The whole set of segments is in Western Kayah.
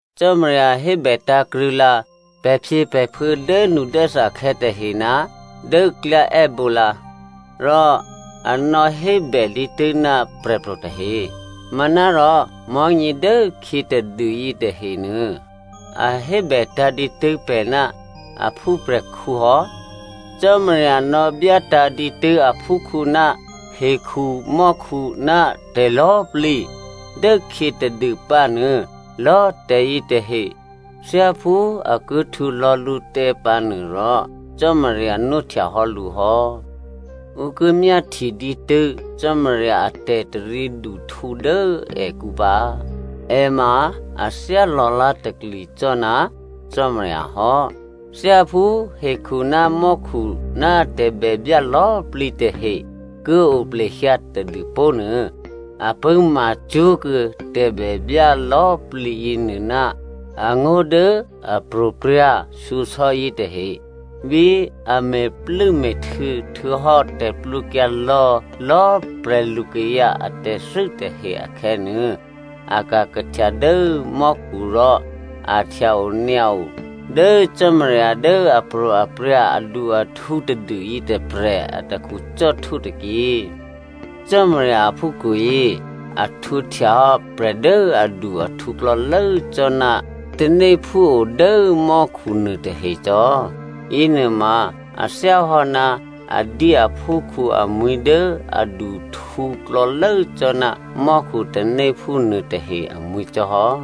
Cò́marya hébè tǎ̤krṳ̂̌lǎ pè̤phyěpè̤phuô̌ dốnudốthakhè̌ tahe ná dố klyá è́bǒ lǎ. Rò a nò̌hébè dǐtû́ ná prè̤pro̤ tahe. Manárò mò̤́nyě dố khyě tadû yětahenuô, a hébètǎ̤ dǐtû́ pè̤ ná a phúprè̤khǔ hò́. Cò́marya nò̌byátǎ̤ dǐtû́ aphúkhǔ ná hekhu mò́khu ná tè̤lò̌꤮ plǐ. Dố khyě tadû pǎnuô, lò̌꤮ tè̤yětahe thyáphú a ki htwǒ lò̌ lǔtè̤ pǎ nuôrò Cò́marya nwóhtyahò́ lǔ hò́. Ǔ ki myáhtye dǐtû́ Cò́marya a tè̤taryěduhtǔ dố èkǔ pǎ. È ma a thyá lò̌lá̤takli cò́ ná Cò́marya hò́. Thyáphú hekhu ná mò́khu ná tè̤bèbyá lò̌꤮ plǐ tahe ki o plehyǎ tadû pó̤ nuô, a pṳ̂́ma cwó̤kuô̌ tè̤bèbyá lò̌꤮ plǐ yěnuô ná angó̤ dố apro̤prya̤ shyosò̌ yětahe. Bí a me̤plû́me̤htuô̌ htuô̌hò́ tè̤plwǒkyǎ lò̌lò̌꤮ prè̤lukayǎ atè̤thû́ tahe akhè̌nuô, a ka̤ kahtya dố mò́khu rò a htya-onyǎo dố Cò́marya dố apro̤aprya̤ adu-ahtǔ tadû yětôprè̤ atakhu cò́htwó tôkyě. Cò́marya aphúkhǔyě a htwǒhtyahò́ prè̤ dố adu-ahtǔ klò̌lố cò́ ná tanéphú o dố mò́khu nuôtahe cò́. Yěnuôma a thyáhò́ ná a dyé aphúkhǔ amwi̤ dố aduhtǔ klò̌lố cò́ ná mò́khu tanéphú nuôtahe amwi̤ cò́ hò́.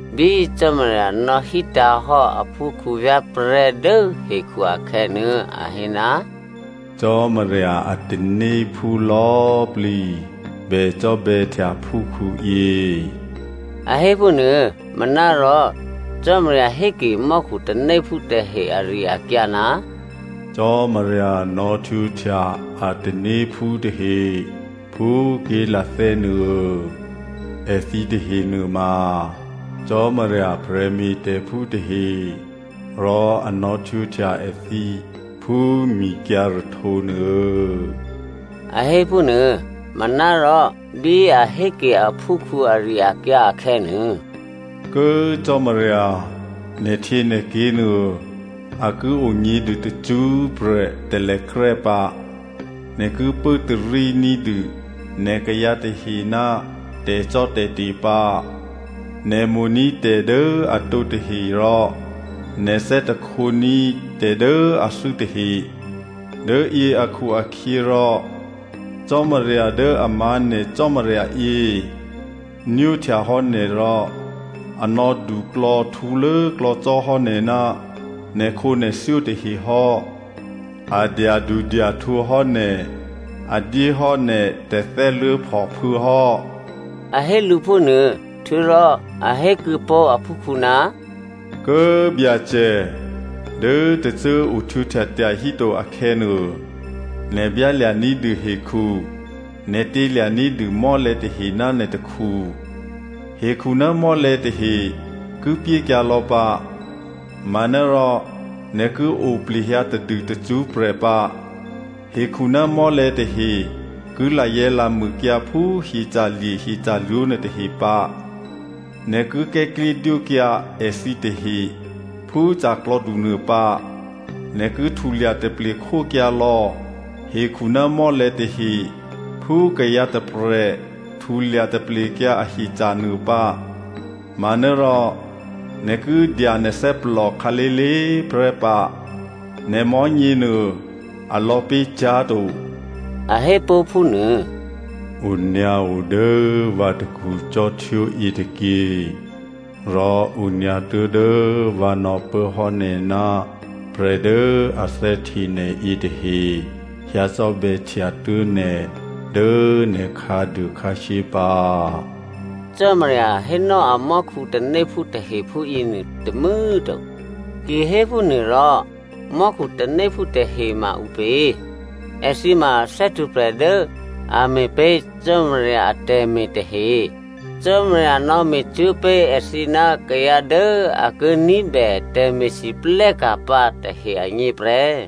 Bí Cò́marya nò̌hítǎ̤hò́ aphúkhǔ vyá̤prè̤́ dố hekhu akhè̌nuô, a hé, “Cò́marya a tanéphú lò̌꤮ plǐ bè cò́bè̌htya phúkhǔyě,” a hé phúnuô. Manárò Cò́marya héke mò́khu tanéphú tahe ari-akyǎ, “Cò́marya nò̌htwǒhtya a tanéphú tahe phú ké̤lathè́ nuô. Èthǐ tahe nuôma Cò́marya prè̤me̤tè̤phú tahe rò a nò̌htwǒhtya èthǐ phú mikyǎ̤rahtǒ nuô,” a hé phúnuô. Manárò, bí a héke aphúkhǔ ari-akyǎ akhè̌nuô, “Kố꤮ Cò́marya nè̤htyěnè̤ké̤ nuô, a ki onyě̤dû tacṳ́prè̤ talèkrè́ pǎ꤮. Nè̤ ki pốtarí ní̤dû nè̤ kayǎ tahe ná tè̤cò́tè̤te̤ pǎ꤮. Nè̤ mo̤ní̤ tè̤ dố atǒ tahe rò nè̤ thè́htení̤ tè̤ dố athû́ tahe. Dố yě akhu-akhyěrò Cò́marya dố a má̤ nè̤ Cò́marya yě nwóhtya hò́ nè̤ rò a nò̌ duklò̌htǔlốklò̌ cò́hò́ nè̤ ná nè̤khǒnè̤thyó tahe hò́. A dyadudyahtǔ hò́ nè̤, a dyéhò́ nè̤ tè̤thè́luố̤phòphû̌ hò́,” a hé lǔ phúnuô. Htuô̌rò a hékuô̌ pó̤ aphúkhǔ, “Kố꤮ Byacè, dố tôcô꤮ ohtwǒhtya tyahíto akhè̌nuô, nè̤ byálya̤ ní̤dû hekhu, nè̤ tělya̤ ní̤dû mò́lè̤̌ tahe ná nè̤ takhu. Hekhu ná mò́lè̤̌ tahe ki pyékyǎ lò̌ pǎ manárò nè̤ ki oplehyǎ tadû tacṳ́prè̤ pǎ. Hekhu ná mò́lè̤̌ tahe ki lazè̤̌lamûkyǎ phú hyeca̤lye̤ hyeca̤lwǒ nuôtahe pǎ. Nè̤ ki kè̤́klyédwókyǎ èthǐ tahe phú ca̤klò̌du nuô pǎ. Nè̤ ki htulya taple khókyǎ lò̌ hekhu ná mò́lè̤̌ tahe phú kayǎ tôprè̤ htulya taplekyǎ ahyeca̤ nuô pǎ. Manárò nè̤ ki dya nè̤ thè́plò khǎlé̤lé̤꤮ prè́ pǎ. Nè̤ mò̤́nyěnuô, a lò̌pé̤ cyá̤to,” a hépó̤ phúnuô. “Onyǎo dố vǎ takhu cò́htwó yětôkyě, rò onyǎ tuố̤dố vǎ nò̌pốhò́ nè̤ ná prè̤ dố a thè́hte nè̤ yětahe hyǎ cò́bè̌htya tuố̤ nè̤ dố nè̤ khǎduô khǎshyé pǎ,” Cò́marya hénò́ amò́khu tanéphú tahe phúyěnuô tômû̌꤮ to. Kihéphúnuôrò, mò́khu tanéphú tahe ma ǔpě? Èthǐ ma thè́htwǒprè̤ dố a me̤pé̤ Cò́marya atè̤me̤ tahe. Cò́marya nò̌me̤cwó̤ pé̤ èthǐ ná kayǎ dố a ki ní̤bè tè̤me̤lwóhteka̤ pǎ tahe agně prè́.